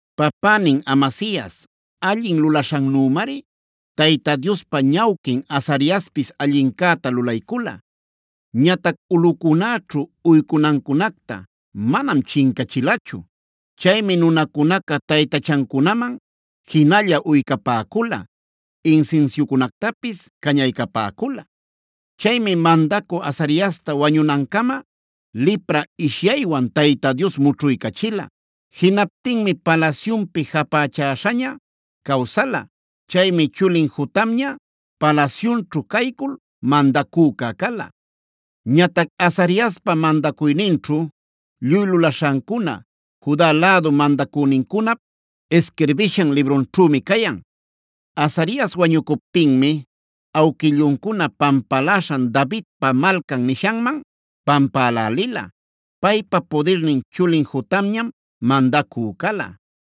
Papänin Amasias allin lulaśhannümari Tayta Diospa ñawquin Azariaspis allincäta lulaycula. Ñatac ulꞌucunäćhu uycunancunacta manam chincachilachu. Chaymi nunacunaca taytachancunaman jinalla uycapäcula, insinsiucunactapis cañaycapäcula. Chaymi mandacü Azariasta wañunancama lipra ishyaywan Tayta Dios mućhuycachila. Jinaptinmi palasyunpi japächäśhaña cawsala. Chaymi chulin Jotamña palasyunćhu caycul mandacüca cala. Ñatac Azariaspa mandacuyninćhu lluy lulaśhancuna Juda lädu mandacünincunap isquirbishan librunćhümi cayan. Azarias wañucuptinmia awquilluncuna pampaläśhan Davidpa Malcan nishanman pampälälila. Paypa pudirnin chulin Jotamñam mandacü cala.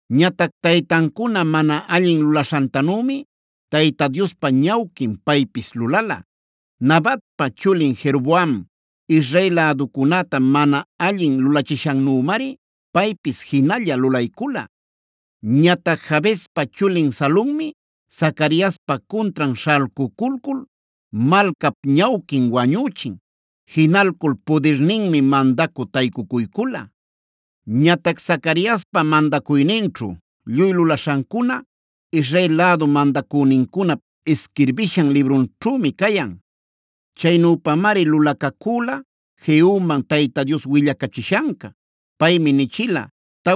Ñatac taytancuna mana allin lulaśhantanümi Tayta Diospa ñawquin paypis lulala. Nabatpa chulin Jeroboam Israel läducunäta mana allin lulachishannümari paypis jinalla lulaycula. Ñatac Jabespa chulin Salummi Zacariaspa cuntran śhalcuculcul malcap ñawquin wañüchin. Jinalcul pudirninmi mandacü taycucuycula. Ñatac Zacariaspa mandacuyninćhu lluy lulaśhancuna Israel lädu mandacünincunap isquirbishan librunćhümi cayan. Chaynüpamari lulacacüla Jehuman Tayta Dios willacachishanca. Paymi nichila: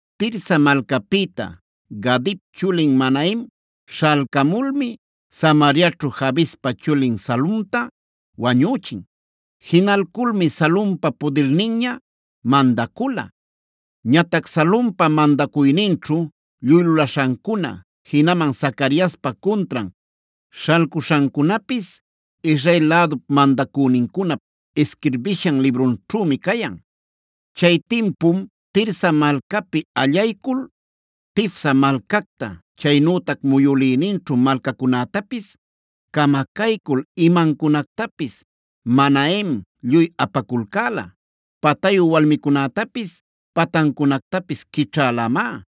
Tirsa malcapïta Gadip chulin Manahem śhalcamulmi Samariaćhu Jabespa chulin Salumta wañüchin. Jinalculmi Salumpa pudirninña mandacula. Ñatac Salumpa mandacuyninćhu lluy lulaśhancuna, jinaman Zacariaspa cuntran śhalcuśhancunapis Israel lädu mandacünincunap isquirbishan librunćhümi cayan. Chay timpum Tirsa malcapi allaycul Tifsa malcacta, chaynütac muyülïninćhu malcacunätapis camacaycul imancunactapis Manahem lluy apaculcäla. Patayu walmicunätapis patancunactapis quićhälamá.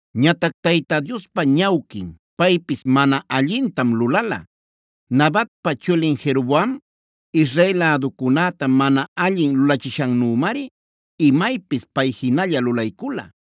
Ñatac Tayta Diospa ñawquin paypis mana allintam lulala. Nabatpa chulin Jeroboam Israel läducunäta mana allin lulachishannümari imaypis pay jinalla lulaycula.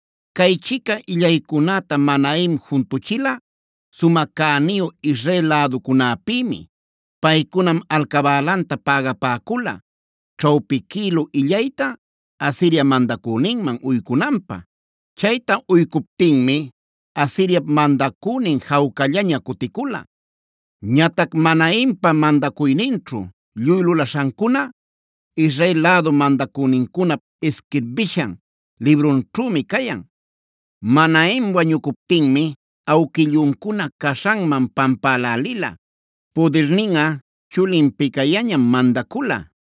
Caychica illaycunäta Manahem juntuchila sumä cäniyu Israel läducunäpïmi. Paycunam alcabälanta pägapäcula ćhawpi quïlu illayta Asiria mandacüninman uycunanpä. Chayta uycuptinmi Asiriap mandacünin jawcallaña cuticula. Ñatac Manahempa mandacuyninćhu lluy lulaśhancuna Israel lädu mandacünincunap isquirbishan librunćhümi cayan. Manahem wañucuptinmi awquilluncuna caśhanman pampälälila. Pudirninꞌa chulin Pekaiañam mandacula.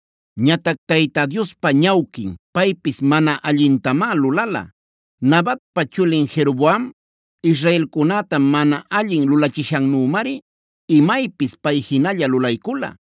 Ñatac Tayta Diospa ñawquin paypis mana allintamá lulala. Nabatpa chulin Jeroboam israelcunäta mana allin lulachishannümari imaypis pay jinalla lulaycula.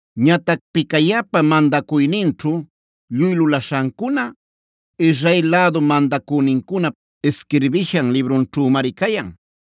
Ñatac Pekaiapa mandacuyninćhu lluy lulaśhancuna Israel lädu mandacünincunap isquirbishan librunćhümari cayan.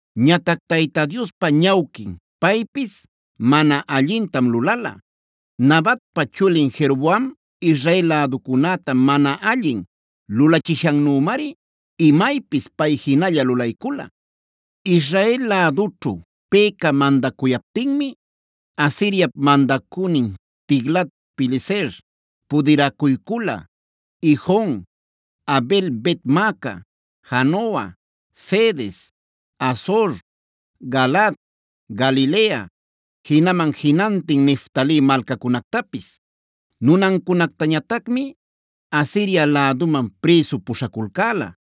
Ñatac Tayta Diospa ñawquin paypis mana allintam lulala. Nabatpa chulin Jeroboam Israel läducunäta mana allin lulachishannümari imaypis pay jinalla lulaycula. Israel lädućhu Peka mandacuyaptinmi Asiriap mandacünin Tiglat-pileser pudiracuycula Ijon, Abel-bet-maaca, Janoa, Cedes, Hazor, Galaad, Galilea, jinaman jinantin Neftali malcacunactapis. Nunancunactañatacmi Asiria läduman prïsu puśhaculcäla.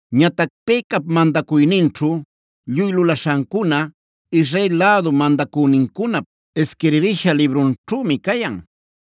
Ñatac Pekap mandacuyninćhu lluy lulaśhancuna Israel lädu mandacünincunap isquirbisha librunćhümi cayan.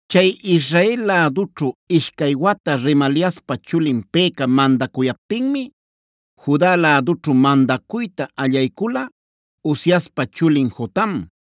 Chay Israel lädućhu ishcay wata Remaliaspa chulin Peka mandacuyaptinmi Juda lädućhu mandacuyta allaycula Uziaspa chulin Jotam.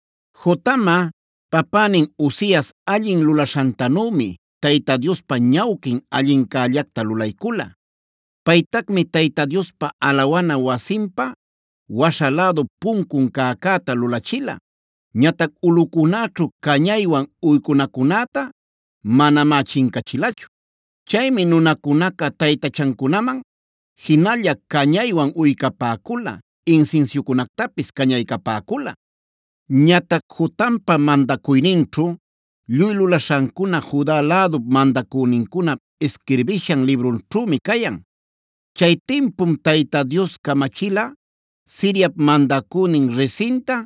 Jotamꞌa papänin Uzias allin lulaśhantanümi Tayta Diospa ñawquin allincällacta lulaycula. Paytacmi Tayta Diospa alawana wasinpa waśha lädu puncun cäcäta lulachila. Ñatac ulꞌucunäćhu cañaywan uycunacunäta manamá chincachilachu. Chaymi nunacunaca taytachancunaman jinalla cañaywan uycapäcula, insinsiucunactapis cañaycapäcula. Ñatac Jotampa mandacuyninćhu lluy lulaśhancuna Juda lädu mandacünincunap isquirbishan librunćhümi cayan. Chay timpum Tayta Dios camachila Siriap mandacünin Rezinta,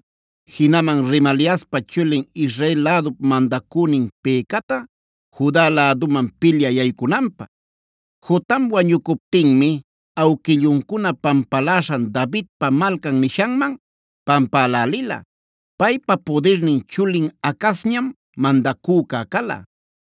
jinaman Remaliaspa chulin Israel lädup mandacünin Pekata Juda läduman pilyä yaycunanpä. Jotam wañucuptinmi awquilluncuna pampaläśhan Davidpa Malcan nishanman pampälälila. Paypa pudirnin chulin Acazñam mandacüca cala.